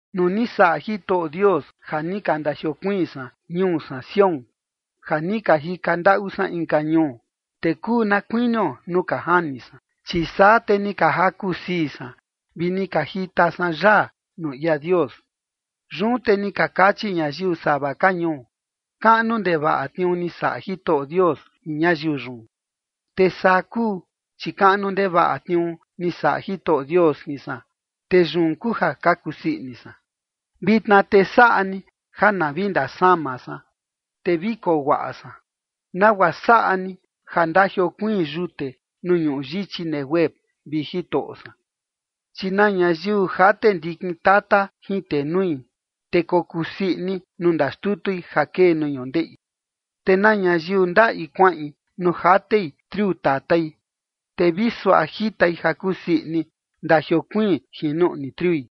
Nuu ni saꞌa Jitoꞌo Dios ja ni ka ndajiokuiin san ñuu san Sión, ja ni ka jika ndaꞌu san inka ñuu, te kuu na kuinio nuu ka jani san. Chi saa te ni ka jaku sii san vi ni ka jita san yaa nuu ia Dios. Yun te ni ka kachi ñayiu sava ka ñuu: “Kaꞌnu ndevaꞌa tniuu ni saꞌa Jitoꞌo Dios jin ñayiu yun”. Te saa kuu, chi kaꞌnu ndevaꞌa tniuu ni saꞌa Jitoꞌo Dios jin san, te yun kuu ja ka kusii ini san. Vitna te saꞌa ni ja na vi ndasama san, te vi koo guaꞌa san, nagua saꞌa ni ja ndajiokuiin yute nuu ñuꞌu yichi Neguev, vi Jitoꞌo san. Chi na ñayiu jate ndikin tata jin tenui, te kokusii ini nuu ndaxtutui ja kee nuu ñundeꞌi. Te na ñayiu ndaꞌi kuaꞌin nuu jatei triu tatai, te vi suaꞌa jitai ja kusii ini ndajiokuiin jin nuꞌni triui.